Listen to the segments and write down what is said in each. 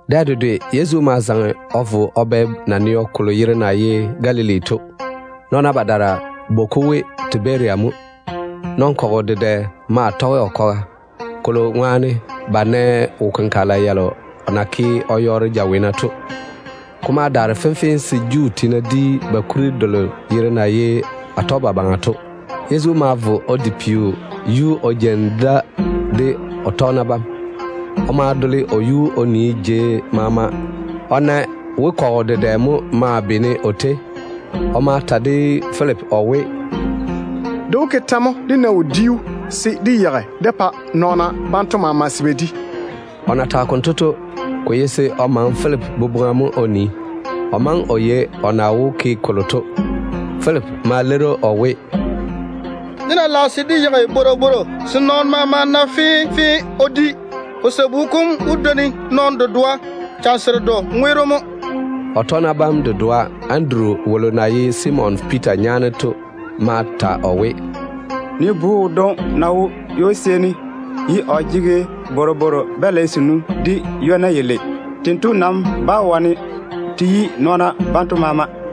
Dɛ dedwe Yezu ma zaŋe o vo o bɛ naneo kolo yere na ye Galili to. Nɔɔna badaara bwoi-ko we Tiberia mo. Nɔn-kɔgɔ dedɛ maa tɔge o kwaga, ba na nɛ wo-kenkagela yalo o na ke o yɔɔre jaweena to ŋwaane. Ko ma daare fenfee se Juu tiina di ba kuri delo yere na ye Atɔgebabaŋa to. Yezu ma vo o di peo yuu o jeini da de o tɔgena bam. O ma dole o yuu o nii jei maama o na we kɔgɔ dedɛ mo maa beene o tei. O ma ta de Filipi o we, “Dé wó ke tɛ mo dé na wodiu se dé yeigi dé pa nɔɔna banto maama se ba di?” O na tage konto to, ko ye se o maŋe Filipi boboŋa mo o nii. O maŋe o yei o na wó ke kolo to. Filipi ma leiri‑o o we, “Dé ná lage se dé yeigi bworobworo se nɔɔno maama na fenfee o di, ko sabu kom wó dwoni nɔɔno dedoa chane seredo ŋweero mo.” O tɔgena bam dedoa, Anduru wolo na ye Simon Piita nyaane to ma ta o we, “Nii bu wodwoŋi mo wo ywo-seeni, o jege bworobworo-balɛ senu de ywona yalei. Tento nam bá wane te yi nɔɔna banto maama.”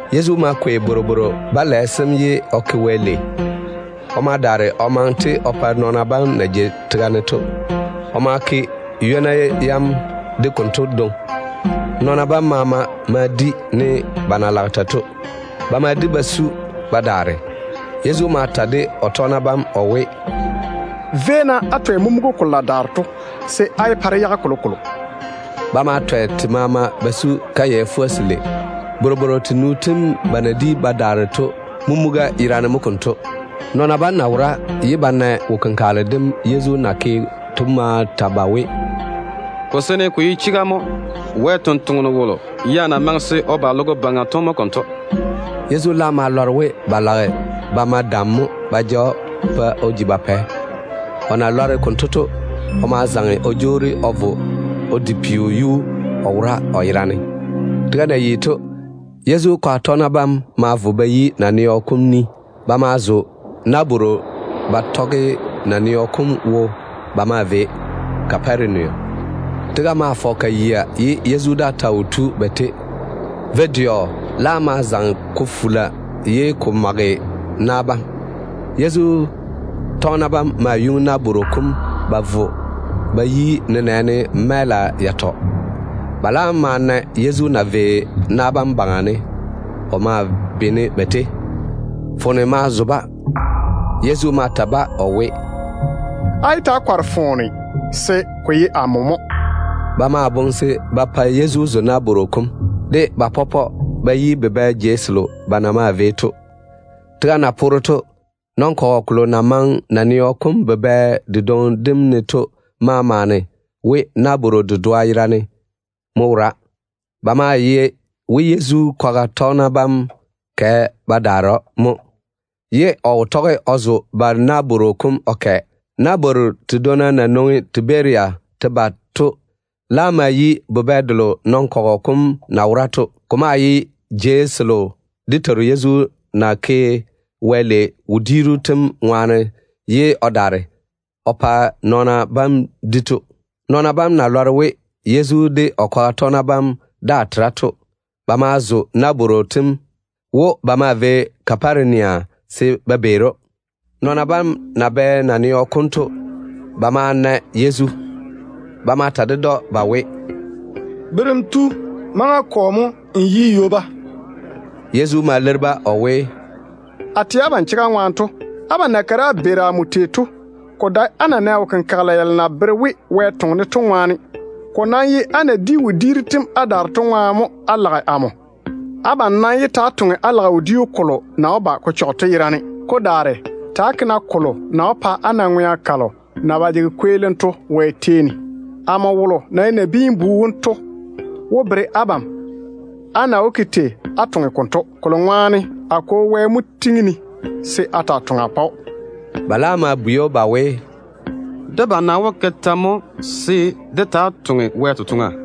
Yezu ma kwei bworobworo-balɛ sem ye o ke Wɛ lei. O ma daare o maŋe-te o pa nɔɔna bam na jei tega ne to. O ma ke ywona yam de konto dwoŋi. Nɔɔna bam maama ma di ne ba na lage tei to. Ba ma di ba su ba daare. Yezu ma ta de o tɔgena bam o we, “Véi-na á twɛ mumuga kalo na daare to, se á yé pa dé yage kolokolo.” Ba ma twɛ ka maama ba su kayɛ fuga-selei. Bworobworo tenu tem ba na di ba daare to mumuga yerane mo konto. Nɔɔna bam na wora ye ba na wo-kenkagele dem Yezu na ke to ma ta ba we, “Ko seene ko ye chega mo, Wɛ ni-jwoŋinu wolo ya na maŋe se o ba logo baŋa to mo konto.” Yezu laam ma lɔre we ba lage ba ma dam mo ba ja‑o ba pa o ji ba pɛ. O na lɔre konto to, o ma zaŋe o jwoori o vo o di peo yuu o wora o yerane. Tega na yi to, Yezu kwaga tɔgena bam ma vo ba yi naneo kom ni. Ba ma zo nabworo ba tɔge naneo kom wo ba maa vei Kaparenia. Tega maa fɔge ka yia ye Yezu daa ta wo tu ba tei. Vo-dɛɔ laam ma zaŋe ko fula ye ko mage na bam. Yezu tɔgena bam ma yuŋi nabworo kom ba vo ba yi nenɛɛne mɛɛla yatɔ. Ba laam ma na Yezu na vei na bam baŋa ne o maa beene ba tei. Foone ma zo-ba. Yezu ma ta-ba o we, “Yé ta‑á kɔre-na foone, se ko ye amo mo.” Ba ma boŋe se ba pa Yezu zo nabworo kom, de ba pɔpɔ ba yi bubɛ jei selo ba na maa vei to. Tega na poore to, nɔn-kɔgɔ kolo na maŋe naneo kom bubɛ dedwoŋi dem ne to ma maane we nabworo dedoa yerane ya mo wora. Ba maa yei we Yezu kwaga tɔgena bam kɛ ba daare‑o mo, ye o wo dɛ o zo ba nabworo kom o kɛ. Nabwooru tedwonna na nwoŋi Tiberia te ba to laam ma yi bubɛ delo nɔn-kɔgɔ kom na wora to. Ko maa ye jei selo dé Teiru Yezu ya na ke Wɛ lei wodiiru tem ŋwaane ye o daare o pa nɔɔna bam di to. Nɔɔna bam na lɔre we Yezu de o kwaga tɔgena bam daa tera to, ba ma zo nabwooru tem wo ba maa vei Kaparenia se ba beeri‑o. Nɔɔna bam na bɛ naneo kom to, ba ma na Yezu. Ba ma bwei‑o ba we, “Berem tu, maŋa kɔ mo n tu ywoba?” Yezu ma leiri-ba o we, “A tɛ abam chega ŋwaane to, abam na kare á beeri amo tei to, ko dae á na nɛ wo-kenkagela yalo na bere we Wɛ toŋe-ne to ŋwaane. Ko nam ye á na di wodiiru tem á daare to ŋwaane mo á lage amo. Abam nam yé ta‑á toŋa á lage wodiu kolo na wó ba ko pɔ to yerane. Ko daare, ta‑á ke kolo na wó pa á na ŋwea kalo na ba jege kweelim Wɛ tei ne to. Amo wolo na ye Nabiin-bu wom to wó pa á na wodiu konto dwoŋi, kolo ŋwaane a Kwo Wɛ mo tiŋi-ne se a taa toŋa a pa‑o.” Ba laam ma bwei‑o ba we, “Debam nam wó ke tɛ mo se dé taa toŋe Wɛ totoŋa?”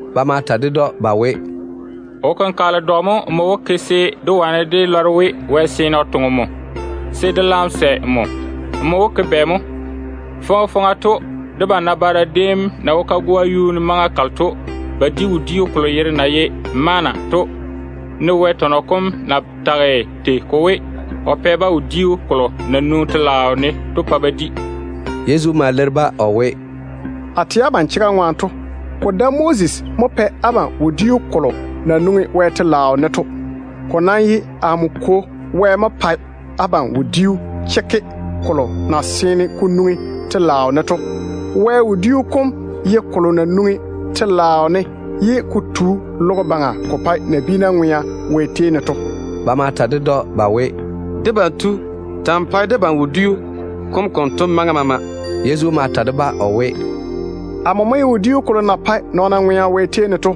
Ba ma ta ded‑o ba we, “Wo-kenkagele dwi dɔ mo nmo wó ke se dé wane dé lɔre we Wɛ seene o toŋe nmo, se dé laam sɛ dé pa nmo? Nmo wó ke bɛ mo? Faŋa faŋa to, dé nabaara déem na wo kagoa yuu ne maŋa kalo to, ba di wodiu kolo yere na ye ‘Manna’ to, ne Wɛ tɔnɔ kom na tage tei ko we, ‘O pɛ-ba wodiu kolo na nwoŋi Wɛ telaao ne to pa ba di.’” Yezu ma leiri-ba o we, “A tɛ abam chega ŋwaane to, ko dae Moses mo pɛ abam wodiu kolo na nwoŋi Wɛ telaao ne to. Ko nam ye amo Kwo Wɛ mo pae abam wodiu chekke kolo na seene ko nwoŋi telaao ne to. Wɛ wodiu kom ye kolo na nwoŋi telaao ne ye ko tu logo baŋa ko pae nabiina ŋwea Wɛ tei ne to.” Ba ma ta ded‑o ba we, “Debam tu, ta‑n pae debam wodiu kom konto maŋa maama.” Yezu ma ta-ba o we, “Amo mo ye wodiu kolo na pae nɔɔna ŋwea Wɛ tei ne to.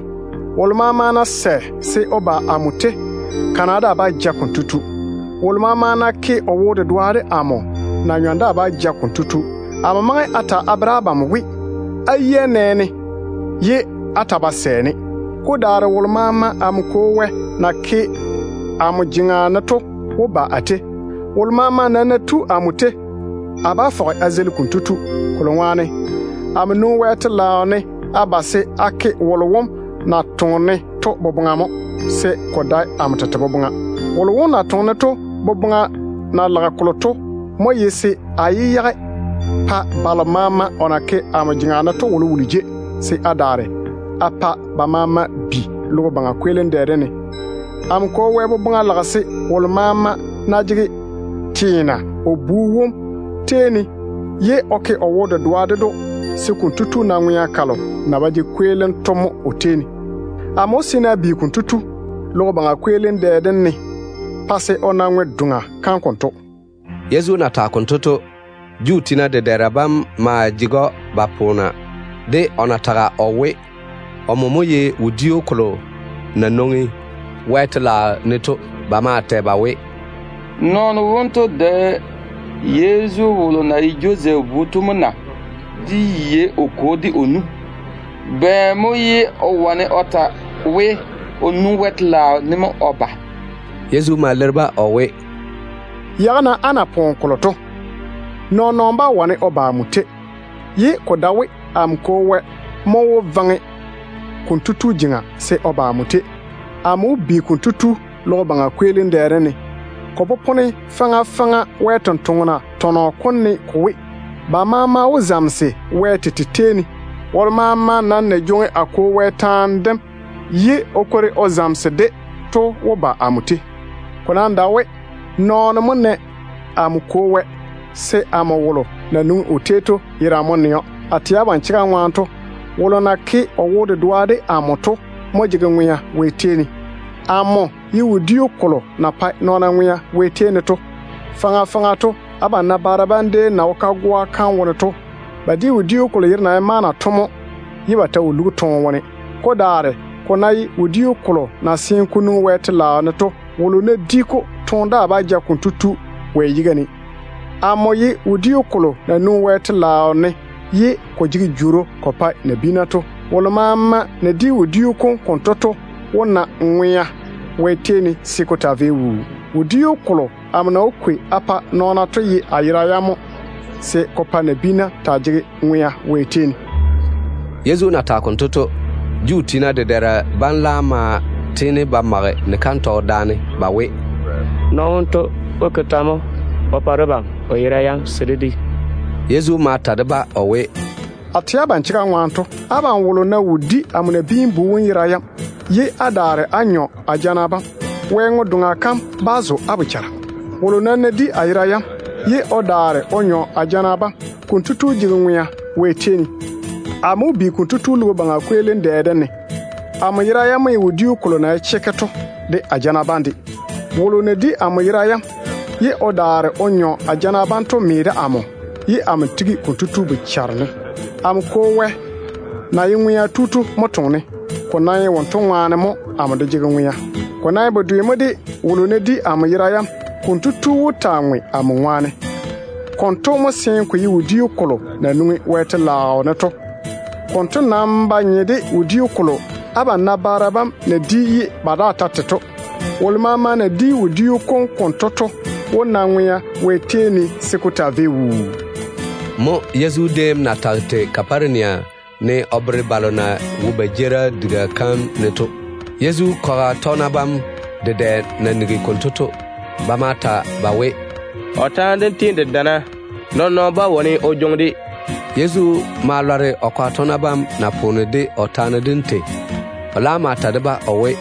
Wolo maama ná sɛ se o ba amo tei, kana daa bá ja konto tu. Wolo maama ná ke o wo-dedoa de amo, na-nyɔm daa bá ja kotu. Amo maŋe a ta a bere abam we, á yia nɛ-ne ye á ta ba jege wo-dedoa de amo. Ko daare wolo maama amo Kwo Wɛ na ke amo jeŋa ne to wó ba a tei. Wolo maama nam ná tu amo tei, a bá fɔge a zeili kotu. Kolo ŋwaane amo nwoŋi Wɛ telaao ne a ba se a ke wolo wom na toŋe-ne to boboŋa mo, se ko dae amo tete boboŋa. Wolo wom na toŋe-ne to boboŋa na lage kolo to mo ye se a yé yage pa balo maama o na ke amo jeŋa ne to wolowolo jei, se a daare a pa ba maama bi logo baŋa kweelim dɛ dem ne. Amo Kwo Wɛ boboŋa lage se wolo maama ná jege teena o Bu wom tei ne ye o ke o wo-dedoa ded‑o, se konto tu na ŋwea kalo na ba jege kweelim o tei ne to. Amo wó seene a bi konto tu logo baŋa kweelim dɛ dem ne pa se o na Wɛ ŋwe-doŋa kam konto.” Yezu na tage konto to, Juu tiina dedɛɛra bam maa jege‑o ba poona de o na tage o we, omo mo ye wodiu kolo na nwoŋi Wɛ telaao ne to. Ba maa tɛ ba we, “Nɔɔno wonto dae Yezu wolo na ye Josɛf bu to mo na? Dé yei o kwo de o nu. Bɛ mo ye o wane o ta we, o nwoŋi Wɛ telaao ne mo o ba?” Yezu ma leiri-ba o we, “Yage-na á pompona kam. Nɔɔn-nɔɔno bá wane o ba amo tei, ye ko dae we amo Kwo Wɛ mo wó vaŋe konto tu jeŋa se o ba amo tei. Amo wó bi konto tu logo baŋa kweelim dɛ dem ne. Ko popone faŋa faŋa Wɛ sampwori tɔnɔ kom ne ko we, ‘Ba maama wó zamese Wɛ tete tei ne.’ Wolo maama nam na jwoŋi a Kwo Wɛ taane dem ye o kwori o zamese-de to wó ba amo tei. Ko nam dae we nɔɔno yia mo nɛ amo Kwo Wɛ, se amo wolo na nwoŋi o tei to yerane mo nɛ‑o. A tɛ abam chega ŋwaane to, wolo na ke o wo-dedoa de amo to mo jege ŋwea Wɛ tei ne. Amo ye wodiu kolo na pae nɔɔna ŋwea Wɛ tei ne to. Faŋa faŋa to, abam nabaara déem na wo kagoa kam wone to, ba di wodiu kolo yere na ye ‘Manna’ to mo, ye ba ta wo lugi toone wone. Ko daare ko ná ye wodiu kolo na seene ko nwoŋi Wɛ telaao ne to, wolo ná di-ko, toone daa bá ja konto tu Wɛ yiga ne. Amo ye wodiu kolo na nwoŋi Wɛ telaao ne ye ko jege jworo ko pae nabiina to. Wolo maama na di wodiu kom konto to wó na ŋwea Wɛ tei ne se ko taa vei wuu. Wodiu kolo amo na wó kwei a pa nɔɔna to ye a ya-nɔna mo, se ko pa nabiina taa jege ŋwea Wɛ tei ne.” Yezu na tage konto to, Juu tiina dedɛɛra bam laam ma tiini ba mage ni-kantɔgɔ daane ba we, “Nɔɔno wonto wó ke tɛ mo o pa debam o ya-nɔna yam se dé di?” Yezu ma ta de-ba o we, “A tɛ abam chega ŋwaane to, abam wolo ná wo di amo Nabiin-bu wom ya-nɔna yam ye o daare o nyɔ a jana bam, Wɛ ŋwe-doŋa kam bá zo kotu bochare. Wolo nam ná di a ya-nɔna yam ye o daare o nyɔ a jana bam, konto tu jege ŋwea Wɛ tei ne. Amo wó bi‑o logo baŋa kweelim dɛ dem ne. Amo ya-nɔna yam mo ye wodiu kolo na ye chekke to, de a jana bam de. Wolo na di amo ya-nɔna yam, ye o daare o nyɔ a jana bam to me de amo, ye amo tigi konto tu bochare ne. Amo Kwo Wɛ na ye ŋwea tu to mo toŋe-ne. Ko nam ye wonto ŋwaane mo amo de jege ŋwea. Ko nam ye bedwe mo de wolo ná di amo ya-nɔna yam, konto tu wó taa ŋwe amo ŋwaane. Konto mo seene ko ye wodiu kolo na nwoŋi Wɛ telaao ne to. Konto nam ba nye de wodiu kolo abam nabaara bam na di ye ba daare ba te to. Wolo maama na di wodiu kom konto to wó na ŋwea Wɛ tei ne se ko taa vei wuu.” Mo Yezu déem na tage tei Kaparenia ne o bere balo na wo Juu tiina jeerim diga kam wone to. Yezu kwaga tɔgena bam dedɛ na nigi konto to, ba ma ta ba we, “O taane dem tiini de dana. Nɔɔn-nɔɔno bá wane o jwoŋi-de.” Yezu ma lɔre o kwaga tɔgena bam na poona de o taane dem tei. O laam ma ta de-ba o we,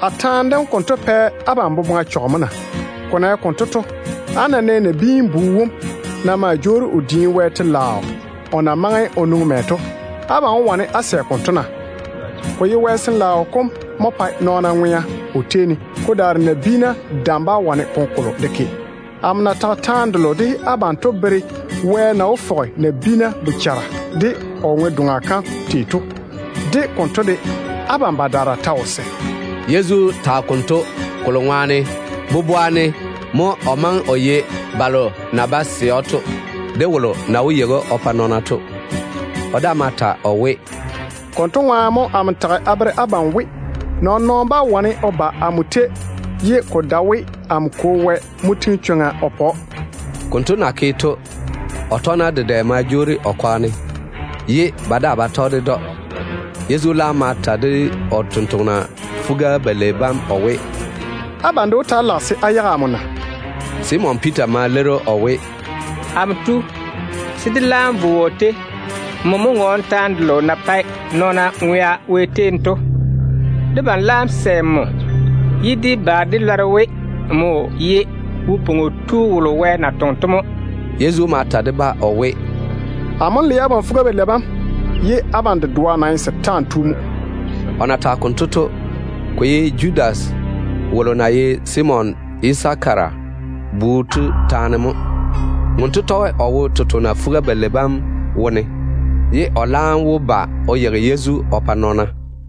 “A taane dem konto pɛ abam boboŋa chɔge mo na? Ko na ye konto to, á ná nɛ Nabiin-bu wom na maa jwoori o diini Wɛ telaao o na maŋe o nwoŋi mɛ to, abam wó wane á sɛ konto na? Ko ye Wɛ Sin-laao kom mo pae nɔɔna ŋwea o tei ne. Ko daare nabiina dam bá wane kolokolo de ke. Amo na tage taane delo de abam to bere Wɛ na wó fɔge nabiina bochara de o ŋwe-doŋa kam tei to. De konto de, abam badaara ta wo sɛ.” Yezu tage konto kolo ŋwaane boboa ne mo o maŋe o yei balo na bá sɛ‑o to, de wolo na wó ba o yeigi‑o o pa nɔɔna to. O daa ma ta o we, “Konto ŋwaane mo amo tage a bere abam we, nɔɔn-nɔɔno bá wane o ba amo tei, ye ko dae we amo Kwo Wɛ mo tiŋi chwoŋa o pa kotu.” Konto na ke to, o tɔgena dedɛ ma jwoori o kwaga ne, ye ba daa ba tɔge‑o. Yezu laam ma ta de o tontoŋena fuga-balei bam o we, “Abam de wó taa lage se á yage amo na?” Simon Piita ma leiri‑o o we, “Amo tu, se dé laam vo wɔ tei? Nmo mo ŋɔɔne taane delo na pae nɔɔna ŋwea Wɛ tei ne to. Debam laam sɛ nmo, ye dé ba dé lɔre we, nmo ye Wo-pwoŋo Tu wolo Wɛ na toŋe to mo.” Yezu ma ta de-ba o we, “Amo le abam fuga-balei bam, abam dedoa nam ye setaane nyem mo.” O na tage konto to, ko ye Judas wolo na ye Simon Yisakara bu to taane mo. Wonto tɔge o wo Yezu tontoŋena fuga-balei bam wone, ye o laam wó ba o yeigi Yezu o pa nɔɔna.